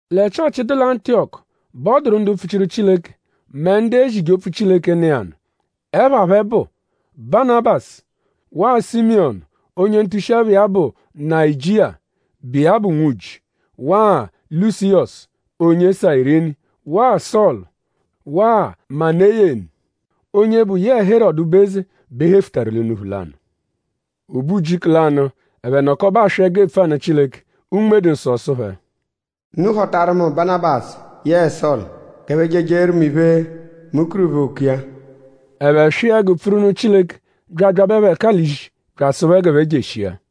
Lẹ Chịochi, dụ lẹ Antiyọku bẹ ọ dụru ndu mpfuchiru Chileke; mẹ ndu ezije opfu Chileke, nọ iya nụ. Ẹpha phẹ bụ: Banabasu; waa Simiyọnu onye ntushi-ẹpha iya bụ Nayijia, bụ iya bụ Nwuji; waa Lusiyọsu onye Sayirini; waa Sọlu; waa Maneyenu; onye bụ yẹe Herọdu, bụ eze bẹ e hefutaru l'unuphu lanụ. O be ujiku lanụ; ẹphe nọkobe aswị ẹgu epfu anụ Chileke. Unme-dụ-Nsọ sụ phẹ: “Unu họtaru mu Banabasu yẹe Sọlu g'ẹphe je ejeeru mu iphe, mu kuru phẹ oku iya.” Ẹphe swịa ẹgu pfuru nụ Chileke bya abyabẹ phẹ ẹka l'ishi bya asụ phẹ g'ẹphe jeshia.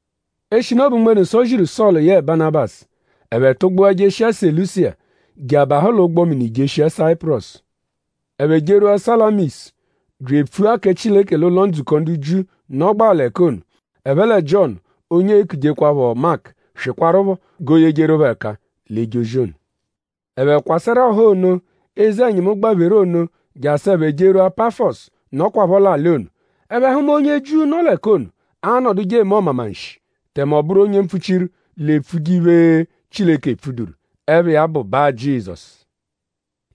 Eshinu ọ bụ Unme-dụ-Nsọ ziru Sọlu yẹe Banabasu; ẹphe tụgbua jeshia Selusiya je abahụ l'ụgbo-mini jeshia Sayipurọsu. Ẹphe jerwua Salamisu bya epfua kẹ Chileke l'ụlo-ndzukọ ndu Jiu, nọgbaa l'ẹka ono. Ẹphe lẹ Jiọnu onye eekujekwaphọ Maku swịkwarupho g'ooyejeru phẹ ẹka l'eje ozi ono. Ẹphe kwasẹru ọha ono, eze-ẹnyimu gbapheru ono jasụ ẹphe jerwua Pafọsu, nọkwapho l'alị ono. Ẹphe hụma onye Jiu, nọ l'ẹka ono, anọduje eme ọmamanshi; tẹme ọ bụru onye mpfuchiru l'epfuje iphe, Chileke epfuduru. Ẹpha iya bụ Ba-Jizọsu.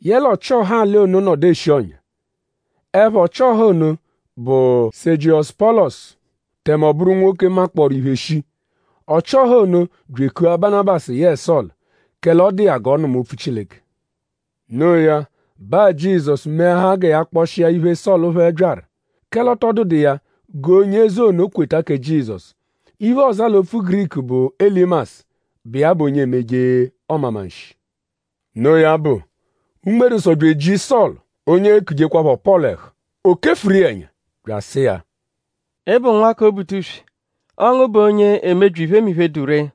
Yẹle ọchi-ọha alị ono nọdu eshi ọ̀nyà. Ẹpha ọchi-ọha ono bụ Sẹjiyosu Pọlosu; tẹme ọ bụru nwoke, makpọoru iphe shii. Ọchi-ọha ono bya ekua Banabasu yẹe Sọlu; kẹle ọ dụ iya g'ọ nụma opfu Chileke. Noo ya; Ba-Jizọsu meahaa gẹ ya kpọshia iphe, Sọlu phẹ byaru; kẹle ọ tọ dụdu iya g'onye eze ono kweta kẹ Jizọsu. Iphe, ọoza l'opfu Giriku bụ Elimasu, bụ iya bụ onye emeje ọmamanshi. Noo ya bụ; Unme-dụ-Nsọ bya eji Sọlu, onye eekujekwaphọ Pọlu ẹhu. O kefuru iya ẹnya; bya asụ iya: “Ị bụ nwa kẹ Obutuswe. Ọo ngu bụ onye emebyi iphemiphe, dụ ree.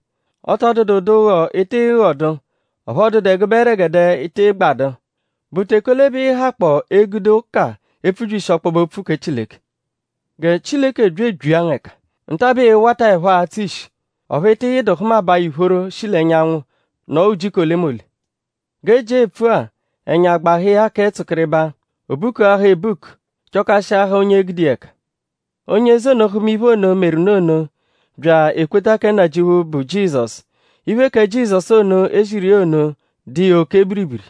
Ọ tọ dụdu ụdu ụgho, ị tịi ghọdu; ọphu ọ dụdu ẹgube ẹregede, ị tịi gbadụ.?Bụ teke ole bẹ ịi-hakpọo egude ụka epfubyishi ọkpobe-opfu kẹ Chileke? Gẹ Chileke bya ebyia ngu ẹka. Nta-a bẹ ịi-wataẹpho atsụ ishi; ọphu ị tịi yịdu hụmabaa ìphóró shi l'ẹnyanwu nọo ujiku olemole.” G'e ejia epfu-a; ẹnya gbahụ iya kẹ tsụkiribaa. O bukuahaa ebuku; chọkashiahaa onye e-gude iya ẹka. Onye eze ono hụma iphe ono, meru nụ ono bya ekweta kẹ Nnajịuphu, bụ Jizọsu. Iphe kẹ Jizọsu ono, e ziru iya ono dụ iya oke biribiri.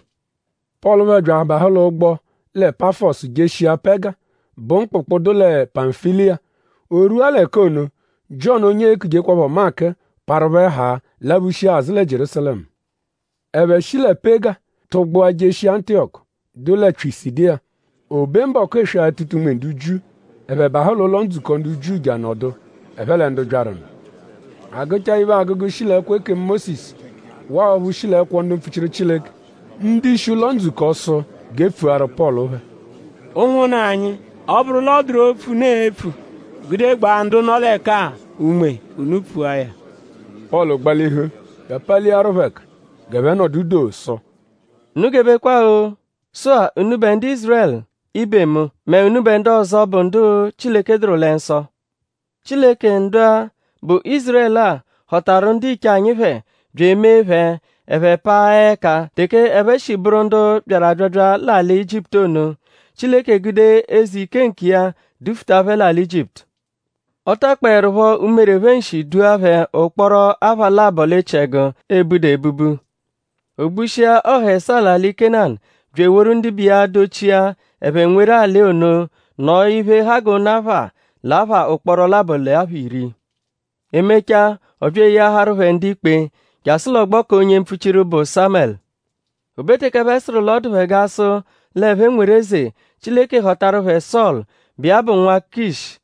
Pọlu phẹ bya abahụ l'ụgbo lẹ Pafọsu jeshia Pega, bụ mkpụkpu, dụ lẹ Pamfiliya. O rwua l'ẹka ono; Jiọnu onye eekujekwaphọ Maku parụ phẹ haa laphushia azụ lẹ Jierúsalẹmu. Ẹphe shi lẹ Pega tụgbua jerwua Antiyọku, dụ lẹ Pyisidiya. O be mbọku eswe-atụta-unme ndu Jiu; ẹphe bahụ l'ụlo-ndzukọ ndu Jiu je anọdu; ẹphe lẹ ndu byaru nụ. A gụchaa iphe agụgu, shi l'ẹkwo ekemu Mósisu waa ọphu shi l'ẹkwo ndu mpfuchiru Chileke; ndu-ishi ụlo-ndzukọ sụ g'e pfuaru Pọlu phẹ: “Ụnwunna anyi; ọ -bụru l'ọ dụru opfu, unu e-pfu gude gbaa ndu-a, nọ l'ẹka-a unme; unu pfua ya.” Pọlu gbalihu bya apaliaru phẹ ẹka g'ẹphe nọdu doo sụ: Unu gebekwa-o! “Sụ-a: unubẹ ndu Ízurẹlu ibe mu mẹ unubẹ ndu ọzo, bụ ndu Chileke dụru lẹ nsọ. Chileke ndu-a, bụ Ízurẹlu-a họtaru ndiche anyi phẹ bya emee phẹ; ẹphe paa ẹka teke ẹphe shi bụru ndu byaru abyabya l'alị Ijiputu ono. Chileke gude eze ike nkiya dufuta phẹ l'alị Ijiputu. Ọ takpọerupho umere phẹ nshi dua phẹ ụkporo apha labọ l'echiẹgu, e budu ebubu. O gbushia ọha ẹsaa l'alị Kénanu bya eworu ndibe iya dochia; ẹphe nweru alị ono nọo iphe, ha g'ụnu apha l'apha ụkporo labọ l'apha iri. “E mechaa; ọ bya eyeaharu phẹ ndu-ikpe jasụ l'ọgbo k'onye mpfuchiru, bụ Sámẹlu. O be teke ẹphe sụru l'ọ dụ phẹ g'a sụ l'ẹphe nweru eze; Chileke họtaru phẹ Sọlu, bụ iya bụ nwa Kịshu;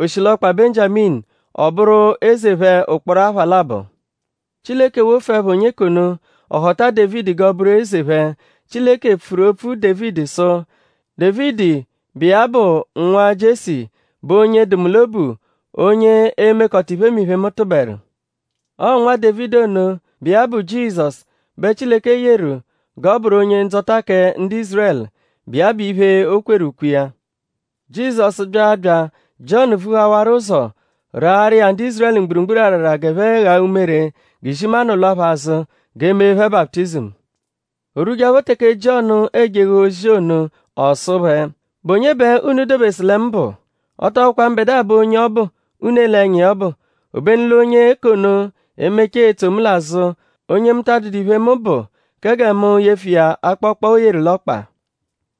oshilọkpa Benjiaminu; ọ bụru eze phẹ ụkporo apha labọ. Chileke wofuẹpho onye k'ono; ọ họta Dévidi g'ọ bụru eze phẹ. Chileke pfuru opfu Dévidi sụ: ‘Dévidi, bụ iya bụ nwa Jiesi bụ onye dụ mu l'obu; onye e-mekọta iphemiphe, mu tụberu.’ Ọo Nwa Dévidi ono, bụ iya bụ Jizọsu bẹ Chileke yeru g'ọ bụru Onye-Ndzọta kẹ ndu Ízurẹlu, bụ iya bụ iphe, o kweru ukwe iya. Jizọsu -bya abya; Jiọnu vuhawaru ụzo raarụ iya ndu Ízurẹlu mgburugburu arara g'ẹphe ghaa umere g'izimanụ lwa phẹ azụ g'e mee phẹ baputizimu. O rwujeẹpho teke Jiọnu e-jeghe ozi ono; ọ sụ phẹ: ‘?Bụ onye bẹ unu dobesụ lẹ mu bụ? Ọ tọ bụkwa mbẹdua bụ onye ọbu, unu ele ẹnya iya ọbu. Obenu l'onye k'ono e-mechaa etso mu l'azụ; onye mu ta adụdu iphe, mu bụ kẹ gẹ mu yefụ iya akpọkpa, o yeru l'ọkpa.’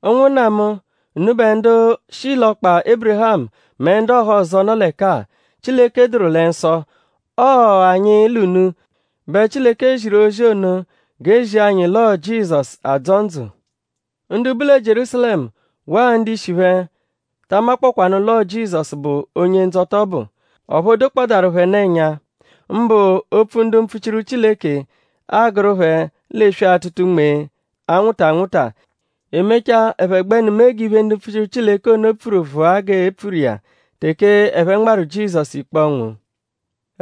“Ụnwunna mu; unubẹ ndu shi l'ọkpa Ébirihamu mẹ ndu ọhozo, nọ l'ẹka-a, Chileke dụru lẹ nsọ! Ọo anyi l'unu bẹ Chileke ziru ozi ono g'e zia anyi l'ọo Jizọsu adzọ ndzụ. Ndu bu lẹ Jierúsalẹmu waa ndu-ishi phẹ ta amakpọkwaanu l'ọo Jizọsu bụ Onye-Ndzọta ọbu. Ọphu o dokpọdaaru phẹ nụ ẹnya; mbụ opfu ndu mpfuchiru Chileke, aagụru phẹ l'eswe-atụta-unme, anwụta anwụta. E mechaa; ẹphe gbẹnu mee g'iphe, ndu mpfuchiru Chileke ono pfuru vụa g'e pfuru iya teke ẹphe nmarụ Jizọsu ikpe ọnwu.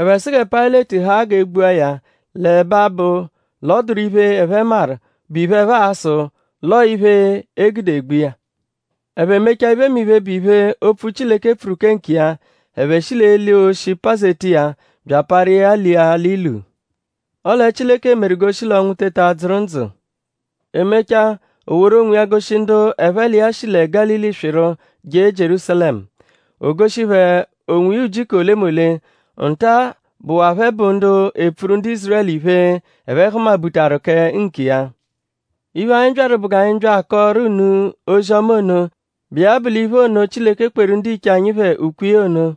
Ẹphe sụ gẹ Payịleti haa g'e gbua ya l'ẹbe abụ l'ọ dụru iphe, ẹphe maru, bụ iphe, ẹphe a-sụ l'ọo iphe, e gude egbu iya. Ẹphe mechaa iphemiphe, bụ iphe, opfu Chileke pfuru kẹ nkiya; ẹphe shi l'eli oshi pazeta iya bya aparu iya lia l'ilu. Ọle Chileke meru g'o shi l'ọnwu teta dzụru ndzụ. E mechaa; o woru onwiya goshi ndu ẹphe l'iya shi lẹ Gálili swịru je Jierúsalẹmu. O goshi phẹ onwiya ujiku olemole. Nta-a bụwaa phẹ bụ ndu epfuru ndu Ízurẹlu iphe, ẹphe hụma-butaru kẹ nkiya. Iphe, anyi byaru bụ g'anyi bya akọoru unu ozi-ọma ono, bụ iya bụ l'iphe ono, Chileke kweru ndiche anyi phẹ ukwe iya ono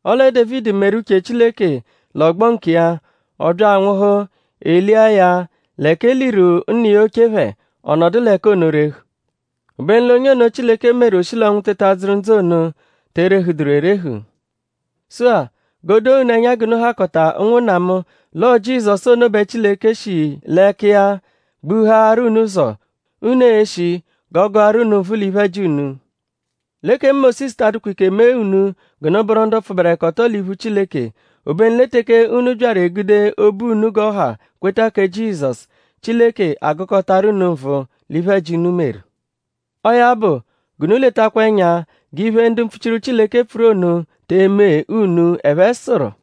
Ọle Dévidi meru uche Chileke l'ọgbo nkiya; ọ bya anwụhu; e lia ya l'ẹka e liru nna iya oche phẹ; ọ nọdu l'ẹka ono rehu. Obenu l'onye ono, Chileke meru o shi l'ọnwu teta dzụru ndzụ ono te erehuduru erehu. Sụ-a; g'o doo unu ẹnya g'unu hakọta ụnwunna mu; l'ọo Jizọsu ono bẹ Chileke shi l'ẹka iya gbuhaarụ unu ụzo, unu e-shi g'ọ gụaru unu nvụ l'iphe-ẹji unu. L'ekemu Mósisu ta adụkwa ike mee unu g'unu bụru ndu pfụberekoto l'iphu Chileke. Obenu lẹ teke unu byaru egude obu unu g'ọ ha kweta kẹ Jizọsu; Chileke agụkotaru unu nvụ l'iphe-ẹji, unu meru. Ọo ya bụ; g'unu letakwa ẹnya g'iphe ono, ndu mpfuchiru Chileke pfuru ono te eme unu. Ẹphe sụru: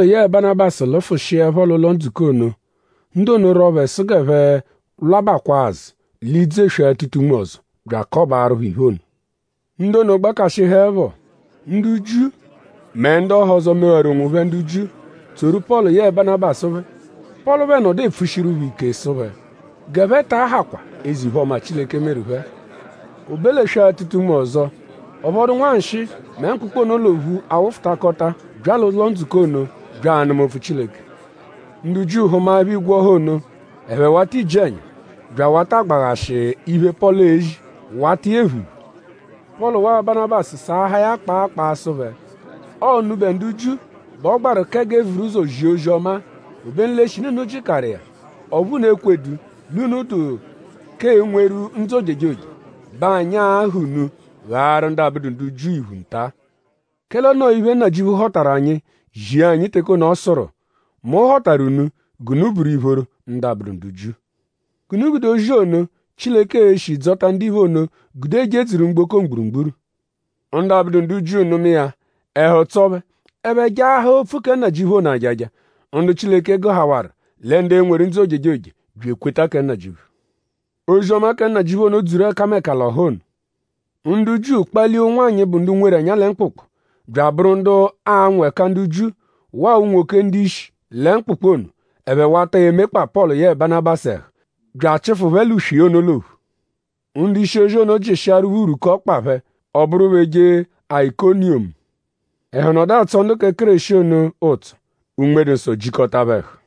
“Pọlu yẹe Banabasu lụfushiepho l'ụlo-ndzukọ ono; ndu ono rwọo phẹ sụ g'ẹphe lwabakwaa azụ l'idzu eswe-atụta-unme ọzo bya akọbaaru phẹ iphe ono. Ndu ono gbakashịhuepho; ndu Jiu mẹ ndu ọhozo, mewaru onwophẹ ndu Jiu; tsoru Pọlu yẹe Banabasu phẹ. Pọlu phẹ nọdu epfushiru phẹ ike sụ phẹ g'ẹphe ta ahakwa eze-iphe-ọma, Chileke meru phẹ. “O be l'eswe-atụta-unme ọzo; ọ phọdu nwanshịi mẹ mkpụkpu ono l'ophu awụfutakota bya l'ụlo-ndzukọ ono bya anụma opfu Chileke. Ndu Jiu hụmaepho igwe ọha ono; ẹphe wata iji-ẹnya bya awata agbaghashị iphe, Pọlu ezi; wata iya ephu iphu. Pọlu waa Banabasu saahaa ya kpaa kpaa sụ phẹ: Ọo unubẹ ndu Jiu bẹ ọ gbaru kẹ g'e vuru ụzo zia ozi-ọma-a. Obenu l'eshinu unu jịkaru iya; ọphu unu ekwedu l'unu dụ k'enweru ndzụ ojejoje bẹ anyi a-ha unu ghaaru ndu abụdu ndu Jiu iphu nta. Kẹle o noo iphe, Nnajịuphu họtaru anyi zia anyi teke ono, ọ sụru: “Mu họtaru unu g'unu bụru ìphóró ndu abụdu ndu Jiu. G'unu gude ozi ono, Chileke e-shi dzọta ndiphe ono gude jedzuru mgboko mgburugburu.” Ndu abụdu ndu Jiu nụma iya; ẹhu tsọo phẹ; ẹphe jaahaa opfu kẹ Nnajịuphu ono ajaja. Ndu Chileke gụhawaru lẹ ndu e-nweru ndzụ ojejoje; bya ekweta kẹ Nnajịuphu. Ozi-ọma kẹ Nnajịuphu ono dzuru ẹkameka l'ọha ono. Ndu Jiu kpalia ụnwanyi, bụ ndu nweru ẹnya lẹ mkpụkpu; bya abụru ndu anwụ ẹka ndu Jiu; waa unwoke ndu-ishi lẹ mkpụkpu ono; ẹphe wata emekpa Pọlu yẹe Banabasu ẹhu; bya achịfu phẹ l'uswe iya ono l'ophu. Ndu-ishi-ozi ono jịshiaru phẹ urwuku ọkpa phẹ; ọ bụru phẹ eje Ayikoniyomu. Ẹhu nọdu atsọ ndu kẹ Kéreshi ono ụtso. Unme-dụ-Nsọ jikọta phẹ ẹhu.